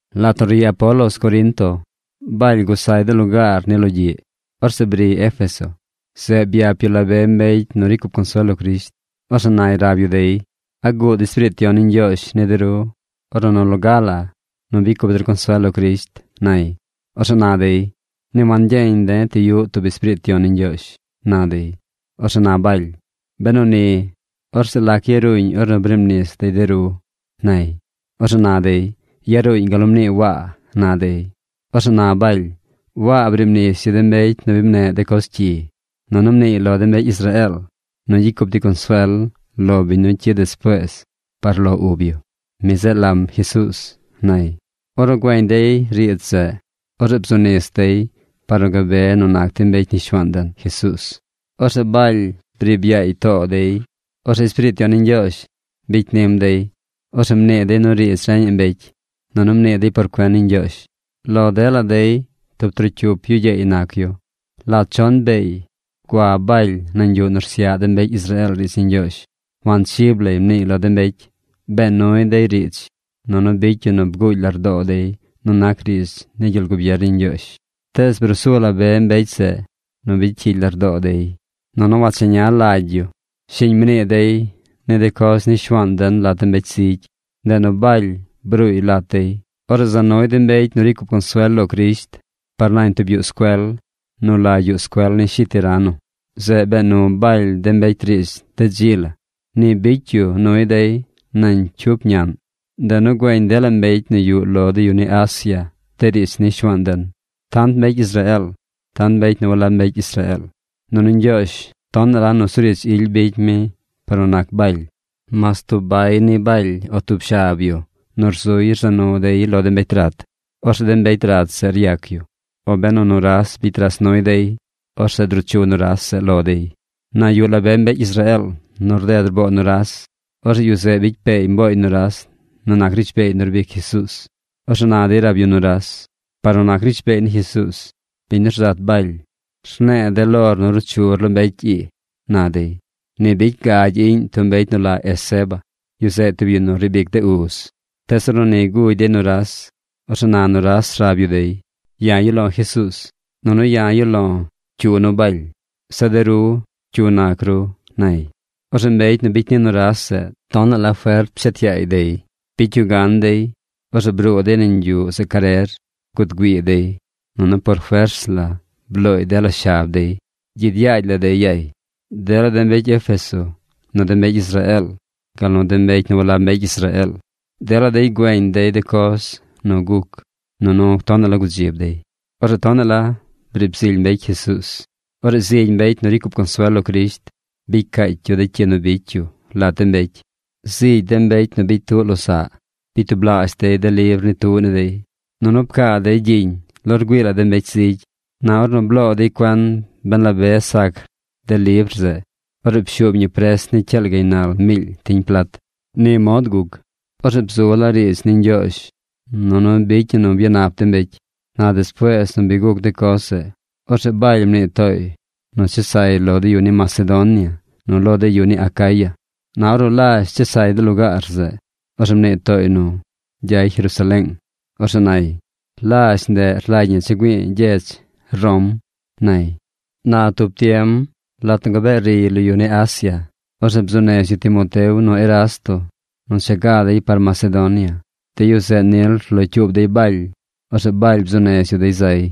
Lat nu ri Apolos Corinto, Baly gusay de lugaar ni logyiꞌ. Orzeꞌ briy Éfeso. Zeꞌ byap yu la be mbecy nu ricy cup consuel lo Crisht. Orzeꞌ nay rab yu dey: ―¿A guud Espiriit Yon ni Ñgyoozh ni de ru, ornu nu loga la nu bicy cup der consuel lo Crisht? ―nay. Orzeꞌ na dey: ―Ni wangyeñ de̱ ti yuꞌ tub Espiriit Yon ni Ñgyoozh ―na dey. Orzeꞌ na Baly: ―Benu ni, orzeꞌ ¿lac yaruuñ ornu briib nis dey de ru? ―nay. Orzeꞌ na dey: ―Yaruuñ gal nu mnii Waa ―na dey. Orzeꞌ na Baly: ―Waa briib nis yu de mbecy nu bi mneꞌ de coz cyi, nunu mniiy lo de mbecy Israeel nu gyicy cup dey consuel lo biñ nu cyid despuees par lo ub yu. Mi zeꞌ lam Jesuuz ―nay. Ornu güeñ dey riidz zeꞌ, orzeꞌ bzu nis dey par nu gabe nu nac dey mbecy ni Shuaan den, Jesuuz. Orzeꞌ Baly briib yaay too dey. Orzeꞌ Espiriit Yon ni Ñgyoozh bicy nim dey. Orzeꞌ mnii dey nu riidz reñaꞌ mbecy, nunu mnii dey por cuen ni Ñgyoozh. Lo dela dey tub trocyup yu gyeey nac yu. Lat chon beey gua Baly nañ yuꞌ nu rsyaꞌ de mbecy Israeel riidz ni Ñgyoozh, wanchib lay mniiy lo de mbecy. Bee nuy dey riidz, nunu bicy yu nu bguugy lardoo dey nu nac riidz ni gyel gubier ni Ñgyoozh. Tees bruu su la be mbecy zeꞌ nu bicy cyigy lardoo dey, nunu wacheña lagy yu. Shiñ mnii dey ni de coz ni Shuaan den lat de mbecy zigy. Ndeꞌ nu Baly bruuy lat dey. Orzeꞌ za nuy de mbecy nu ricy cup consuel lo Crisht par nañ tub yuꞌ scuel, nu la Yuꞌ Scuel ni Shi Tirano. Zeꞌ bee nu Baly de mbecy riidz de dzi la. Ni bicy yu nuy dey nañ cyup ñaꞌn. Ndeꞌ nu güeñ dela mbecy nu yuꞌ lo de yu ni Asia de riidz ni Shuaan den: tant mbecy Israeel, tant mbecy nu walab mbecy Israeel. Nunu Ñgyoozh tonaꞌ la nusuriidz ily bicy mi par nu nac Baly. Mas tub bay ni Baly o tub shab yu nu rzuy rza nu dey lo de mbecy rat. Orzeꞌ de mbecy rat zeꞌ ryac yu. O benu nuras bicy ras nuy dey, orzeꞌ druu chu nuras zeꞌ lo dey. Na yuꞌ la be mbecy Israeel nu rded rboo nuras. Orzeꞌ yu zeꞌ bicy peey mbooy nuras nu nac rishbeey nu rbic Jesuuz. Orzeꞌ na dey rab yu nuras: ―¡Par nu nac rishbeey ni Jesuuz, biñ nu rzat Baly, rne̱e̱ de̱ lor nu ruu chur lo mbecy ii! ―na dey. Ni bicy gagy iꞌñ tub mbecy nu la Esceva. Yu zeꞌ tub yu nu riib ic de uz. Tees ornu ni gugy dey nuras, orzeꞌ na nuras rab yu dey: ―Ya̱ yuꞌ lo̱ Jesuuz, nunu ya̱ yuꞌ lo̱ cyu nu Baly. Zeꞌ de ru ¿cyu nac ru? ―nay. Orzeꞌ mbecy nu bicy ni nuras zeꞌ tonaꞌ la fert pshet yaay dey. Bicy yu gan dey. Orzeꞌ bruu dey nañ yuꞌ zeꞌ carer. Guud güii dey, nunu por fers la blooy dela shab dey. Gyid yaagy la dey yay. Dela de mbecy Éfeso nu de mbecy Israeel gal nu mbecy nu walab mbecy Israeel, dela dey güeñ dey de coz nu guc nunu tonaꞌ la gudzib dey. Orzeꞌ tonaꞌ la briib zily mbecy Jesuuz. Orzeꞌ zigy mbecy nu ricy cup consuel lo Crisht bicy caacy yu de cyi nu bicy yu lat de mbecy. Zigy de mbecy nu bicy tuꞌ losaꞌ bicy tublaazh dey de libr ni tuꞌ ni dey, nunu pcaa dey gyiñ lo rgüii la de mbecy zigy. Na ornu bloo dey cuen ben la be sac de libr zeꞌ, orzeꞌ pshuub ñi pres ni cyaal gaynal miily tiñ plat. Ni mod guc. Orzeꞌ bzu laa riidz ni Ñgyoozh, nunu bicy ñi nu byanap de mbecy. Na despuees nu bi guc de coz zeꞌ, orzeꞌ Baly mnii tooy nu ches say lo de yu ni Macedonia nu lo de yu ni Acaya. Na ornu lazh chesay de lugaar zeꞌ, orzeꞌ mnii tooy nu gyay Jerusaleeng. Orzeꞌ nay: ―Lazh ndeꞌ rlagy ñi cha̱ güi̱i̱ gyedz Rom ―nay. Na tub tiem, lat nu gabee riy lo yu ni Asia se tub tiem, orzeꞌ bzuu nez yu Timoteo nu Erasto nu cha ga dey par Macedonia. De yu zeꞌ nil rlocyuub dey Baly. Orzeꞌ Baly bzuu nez yu dey zay.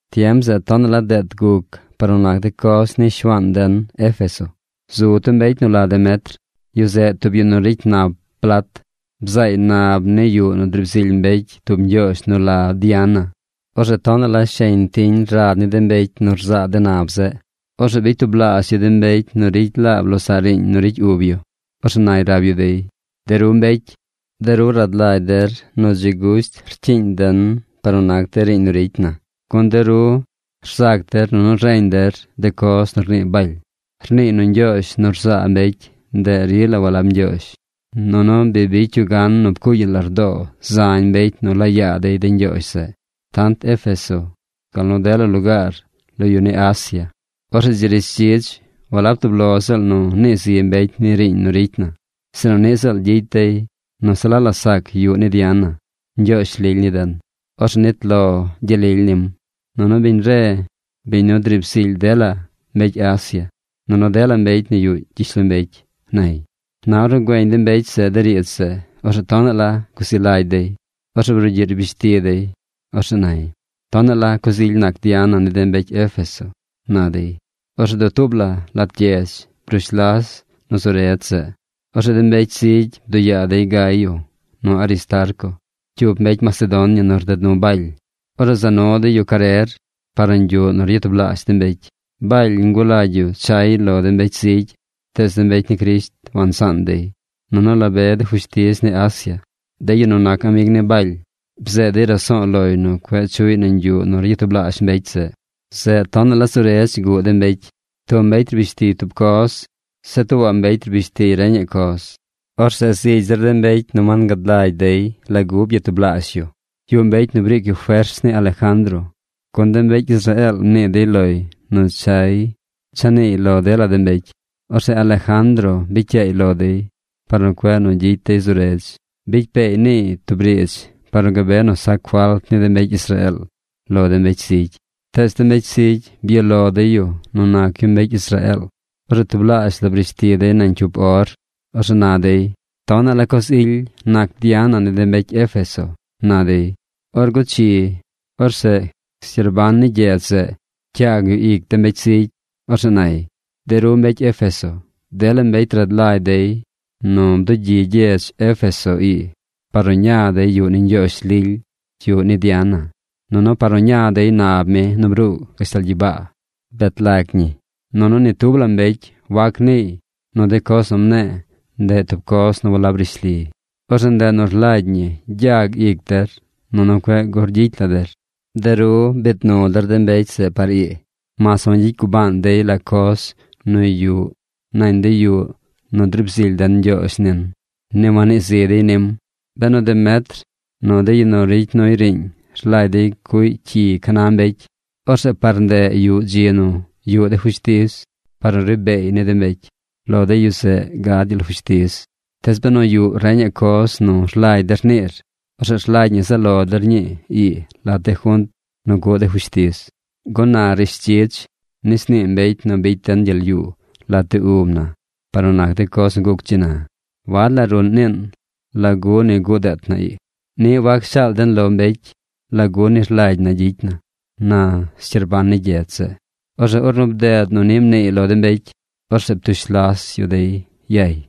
Tiem zeꞌ tonaꞌ la deet guc par nu nac de coz ni Shuaan den Éfeso. Zu tub mbecy nu la Demetr. Yu zeꞌ tub yu nu ricy nap plat. Bzaay nab ni yuꞌ nu driib zily mbecy tub ñgyoozh nu la Diana. Orzeꞌ tonaꞌ la sheñ tiñ rad ni de mbecy nu rzaa de nab zeꞌ. Orzeꞌ bicy tublaazh yu de mbecy nu ricy laab losaꞌ riiñ nu ricy ub yu. Orzeꞌ nay rab yu dey: ―De ru mbecy, de ru rad lagy der nu dzi gusht rcyiiñ den par nu nac riiñ nu ricy na. Gun de ru rzac der nunu reñ der de coz nu rnii Baly. Rniiy nu ñgyoozh nu rzaa mbecy, ndeꞌ rila walab ñgyoozh, nunu bi bicy yu gan nu pcuugy yu lardoo zañ mbecy nu laa yaa dey de ñgyoozh zeꞌ: tant Éfeso gal nu dela lugaar lo yu ni Asia. Orzeꞌ dzi rishdzidz walab tub lo ziꞌl nu nii zi mbecy ni de riiñ nu ricy na, sinu niꞌ ziꞌl gyicy dey nu se la la sac yuꞌ ni Diana, ñgyoozh lily ni den. Orzeꞌ nit lo gyel lily nim. Nunu biñ re biñ nu driib zily dela mbecy Asia, nunu dela mbecy nu yuꞌ gyishlombecy ―nay. Na ornu güeñ de mbecy zeꞌ de riidz zeꞌ, orzeꞌ tonaꞌ la guzi lagy dey. Orzeꞌ brugyiꞌ rbish ti dey. Orzeꞌ nay: ―¡Tonaꞌ la coz ily nac Diana ni de mbecy Éfeso! ―na dey. Orzeꞌ dutuub la lat gyedz brush las nu zu redz zeꞌ. Orzeꞌ de mbecy zigy bduꞌ yaa dey Gayo nu Aristarco, cyup mbecy Macedonia nu rded nu Baly. Orzeꞌ za nu dey yu carer par nañ yuꞌ nu ryatublaazh de mbecy. Baly ngulagy yu chay lo de mbecy zigy tees de mbecy ni Crisht wansaan dey. Nunu la be de fushtiz ni Asia, de yu nu nac amig ni Baly, bzeed dey raso̱o̱ loy nu cueꞌ chuꞌy nañ yuꞌ nu ryatublaazh mbecy zeꞌ. Zeꞌ tonaꞌ la zu redz guꞌ de mbecy. Tub mbecy rbish tiy tub coz. Zeꞌ tuubaꞌ mbecy rbish tiy reñaꞌ coz. Orzeꞌ zigy zir de mbecy nu wangad lagy dey lagu byatublaazh yu. Yuꞌ mbecy nu briic yu fers ni Alejandro, gun de mbecy Israeel mnii dey loy nu chay cha niiy lo dela de mbecy. Orzeꞌ Alejandro bicy yaay lo dey par nu cueꞌ gyicy dey zu redz. Bicy peey niiy tub riidz par nu gabe nu sac falt ni de mbecy Israeel lo de mbecy zigy. Tees de mbecy zigy byuꞌ lo dey yu nu nac yu mbecy Israeel. Orzeꞌ tublaazh la brish ti dey nañ cyup or. Orzeꞌ na dey: ―¡Tonaꞌ la coz ily nac Diana ni de mbecy Éfeso! ―na dey. Or guchi orzeꞌ scyerban ni gyedz zeꞌ pcyaag yu ic de mbecy zigy. Orzeꞌ nay: ―De ru mbecy Éfeso, dela mbecy rad lagy dey nu bdugyi gyedz Éfeso ii par nu ña dey yuꞌ ni ñgyoozh lily, yuꞌ ni Diana, nunu par nu ña dey nab mi nu bruu gashtal gyibaa bet lag ñi. Nunu ni tub la mbecy wac niiy nu de coz nu mne̱e̱ ndeꞌ tub coz nu walab rishli. Orzeꞌ ndeꞌ nu rlagy ñi gyag ic der nunu cueꞌ gur gyicy la der. De ru biid nu der de mbecy zeꞌ par ii mas wangyicy gubaan dey la coz nu yuꞌ nañ de yuꞌ nu driib zily den ñgyoozh nin. Ni wannii zi dey nim. Benu Demetr nu de yu nu ricy nuy riiñ rlagy dey cuꞌy cyi ca na mbecy, orzeꞌ par ndeꞌ yuꞌ dzi nu yuꞌ de fushtiz par nu ri beey ni de mbecy. Lo de yu zeꞌ gad gyel fushtiz. Tees benu yuꞌ reñaꞌ coz nu rlagy der niir, orzeꞌ rlagy ñi zaꞌ lo der ñii ii lat de junt nu cuꞌ de fushtiz. Gun na rishdzidz nis nii mbecy nu bicy den gyel yuu lat de ub na par nu nac de coz nu guc dzi na. Wad la ruꞌn niin lagu ni guꞌ deet na ii. Niꞌ wac shaal den lo mbecy lagu ni rlagy na gyicy na ―na scyerban ni gyedz zeꞌ. Orzeꞌ ornu bded nu ni mniiy lo de mbecy, orzeꞌ ptush las yu dey yay.